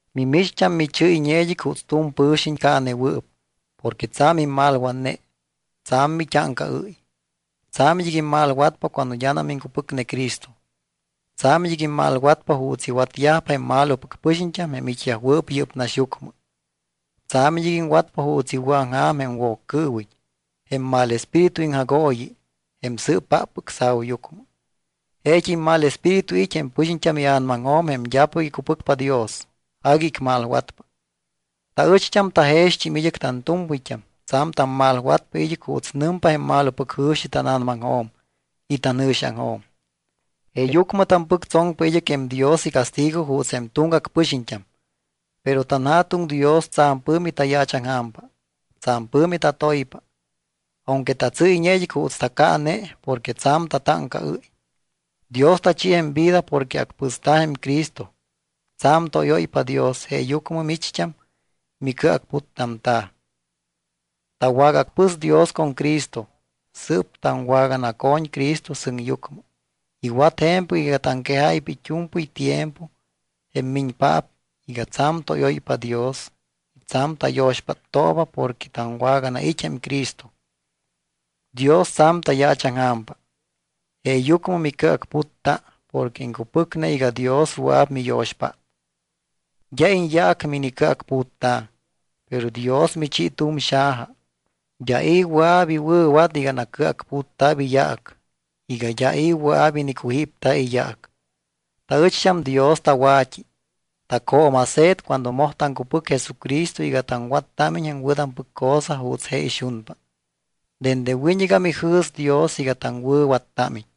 Mimicht́am michɨ́yñe id́ɨc juuts tu̱m pɨ̱xiñ caanewɨɨp porque tsa̱m immalwatne, tsa̱m mit́áŋcaɨ́y. Tsa̱m id́ɨc immalwatpa cuando d́anam iŋcupɨcne Cristo. Tsa̱m id́ɨc immalwatpa juuts iwatyajpa jém malopɨc pɨxiñt́am jém it́yajwɨɨp yɨ́p naxyucmɨ. Tsa̱m id́ɨc iŋwatpa juuts iwɨ̱aŋja̱m jém Woccɨɨwiñ, jém mal espíritu iŋjagooyi, jém sɨɨpáppɨc sa̱uyucmɨ. Jeet́im mal espíritu it́ jém pɨxiñt́am ia̱namaŋjo̱m jém d́apɨc icupɨcpa Dios. Agui icmalwatpa. Taɨcht́am tajext́im id́ɨc. Tantu̱mpɨyt́am tsa̱m tammalwatpa id́ɨc juuts nɨmpa jém malopɨc jɨ̱xi tána̱namaŋjo̱m y tanjɨ̱xiaŋjo̱m. Jeeyucmɨ tampɨctsoŋpa id́ɨc jém Dios icastigo juuts jém tuŋgac pɨxiñt́am. Pero tanJa̱tuŋ Dios tsa̱m pɨ̱mi tayaachaŋja̱mpa. Tsa̱m pɨ̱mi tatoypa. Aunque tatsɨ́yñe id́ɨc juuts tacaane porque tsa̱m tatáŋcaɨ́y, Dios tachi jém vida porque acpɨsta̱ jém Cristo. Tsa̱m tóyóypa Dios jeeyucmɨ micht́am micɨacputtamta̱. Tawagaacpɨs Dios con Cristo, sɨɨp taŋwaganaco̱ñ Cristo sɨŋyucmɨ. Iwat je̱mpɨc iga taŋquejáypa it́u̱mpɨy tiempo, jém miñpaap, iga tsa̱m tóyóypa Dios y tsa̱m tayo̱xpáttooba porque taŋwaganait́ jém Jesucristo. Dios tsa̱m tayaachaŋja̱mpa, jeeyucmɨ micɨacputta porque iŋcupɨcne iga Dios wɨa̱p miyo̱xpát. D́a iñyaac minicɨacputta̱, pero Dios michi tu̱m xaja. D́a i̱ wɨa̱p iwɨ̱wat iga nacɨacputta̱p iyaac, iga d́a i̱ wɨa̱p inicujípta̱ iyaac. Taɨcht́am Dios tawa̱t́i. Tacjooma̱se̱t cuando moj taŋcupɨc Jesucristo iga taŋwattámiñ jém wɨ̱tampɨc cosa juuts je ixunpa. Dende wiñɨgam ijɨ̱s Dios iga taŋwɨ̱wattámiñ.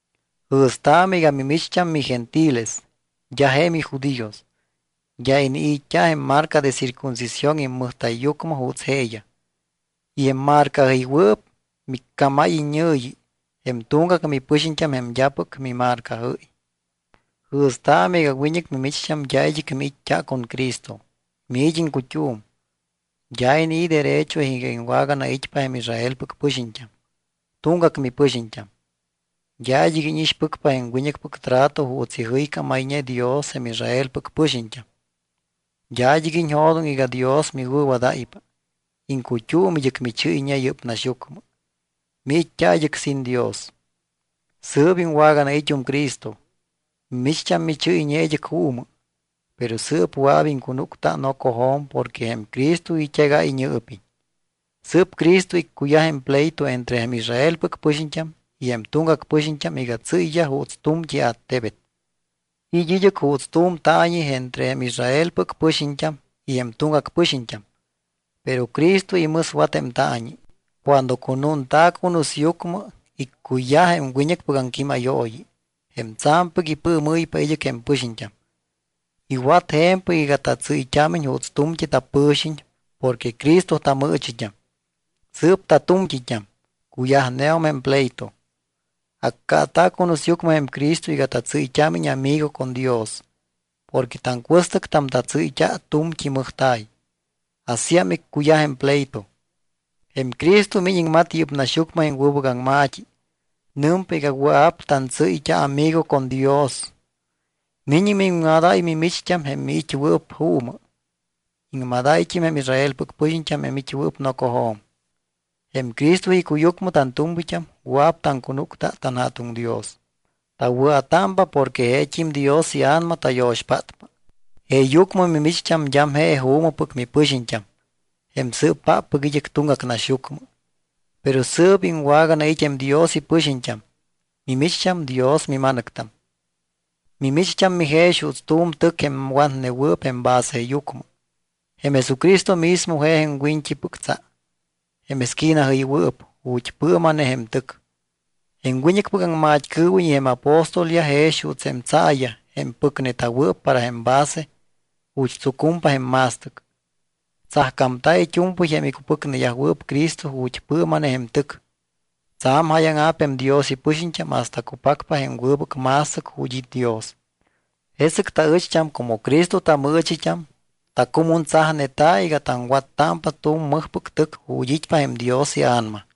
Jɨ̱staamɨ iga mimicht́am migentiles, d́a je mijudíos. D́a inii̱t́a jém marca de circuncisión immɨjta̱yyucmɨ juuts jeeyaj. Y jém marcajɨywɨɨp miccámáy iññɨ̱yi: “Jém tuŋgac mipɨxiñt́am jém d́apɨc mimarcajɨ́y.” Jɨ̱staamɨ iga wiñɨc mimicht́am d́a id́ɨc miit́t́a con Cristo. Miit́ iŋcut́um. D́a inii̱ derecho iga iŋwaganait́pa jém Israelpɨc pɨxiñt́am. Tuŋgac mipɨxiñt́am. D́a id́ɨc íñixpɨcpa jém wiñɨcpɨc trato juuts ijɨycámayñe Dios jém Israelpɨc pɨxiñt́am. D́a id́ɨc iñjo̱doŋ iga Dios miwɨ̱wadáypa. Iŋcut́um id́ɨc michɨ́yñe yɨ́p naxyucmɨ, miit́t́a id́ɨc sin Dios. Sɨɨp iŋwaganait́um Cristo. Mimicht́am michɨ́yñe id́ɨc juumɨ, pero sɨɨp wɨa̱p iŋcunúcta nocojo̱m porque jém Cristo it́egáy iñɨɨpiñ. Sɨɨp Cristo iccuyaj jém pleito entre jém Israelpɨc pɨxiñt́am y jém tuŋgac pɨxiñt́am iga tsɨ́yyaj juuts tu̱mt́i attebet. It́ id́ɨc juuts tu̱m taañi entre jém Israelpɨc pɨxiñt́am y jém tuŋgac pɨxiñt́am, pero Cristo imɨswat jém taañi. Cuando cunúnta̱ cunusyucmɨ, iccuyaj jém wiñɨcpɨc aŋquímayooyi, jém tsa̱mpɨc ipɨɨmɨ́ypa id́ɨc jém pɨxiñt́am. Iwat je̱mpɨc iga tatsɨ́yt́ámiñ juuts tu̱mt́i tapɨ̱xiñ porque Cristo tamɨɨchit́am. Sɨɨp tatu̱mt́it́am, cuyajneum jém pleito. Accaata̱ cunusyucmɨ jém Cristo iga tatsɨ́yt́ámiñ amigo con Dios porque taŋcuɨstɨctam tatsɨ́yt́a tu̱mt́i mɨjta̱y. Asíam iccuyaj jém pleito. Jém Cristo miñ iŋmat yɨ́p naxyucmɨ jém wɨbɨc aŋma̱t́i. Nɨmpa iga wɨa̱p tantsɨ́yt́a amigo con Dios. Miñ miŋmadáy mimicht́am jém miit́wɨɨp juumɨ. Iŋmadáyt́im jém Israelpɨc pɨxiñt́am jém it́wɨɨp nocojo̱m. Jém Cristo icuyucmɨ tantu̱mpɨyt́am wɨa̱p taŋcunúcta tanJa̱tuŋ Dios. Tawɨa̱támpa porque jeet́im Dios iA̱nama tayo̱xpátpa. Jeeyucmɨ mimicht́am d́am je juumɨpɨc mipɨxiñt́am, jém sɨɨpáppɨc id́ɨc tuŋgac naxyucmɨ. Pero sɨɨp iŋwaganait́ jém Dios ipɨxiñt́am. Mimicht́am Dios mima̱nɨctam. Mimicht́am mijex juuts tu̱m tɨc jém watneta̱wɨɨp jém baseyucmɨ. Jém Jesucristo mismo je jém wiñt́ipɨc tsa, jém esquinajɨywɨɨp ju̱t́ pɨɨma̱ne jém tɨc. Jém wiñɨcpɨc aŋmat́cɨɨwiñ y jém apóstolyaj jex juuts jém tsaayaj jém pɨcneta̱wɨɨp para jém base ju̱t́ tsucumpa jém ma̱stɨc. Tsajcámta̱ it́u̱mpɨy jém icupɨcneyajwɨɨp Cristo ju̱t́ pɨɨma̱ne jém tɨc. Tsa̱m jáyaŋa̱p jém Dios ipɨxiñt́am hasta cupacpa jém wɨbɨc ma̱stɨc ju̱t́ it́ Dios. Jesɨc taɨcht́am como Cristo tamɨɨchit́am, tacumuntsajneta̱ iga taŋwattámpa tu̱m mɨjpɨc tɨc ju̱t́ it́pa jém Dios iA̱nama.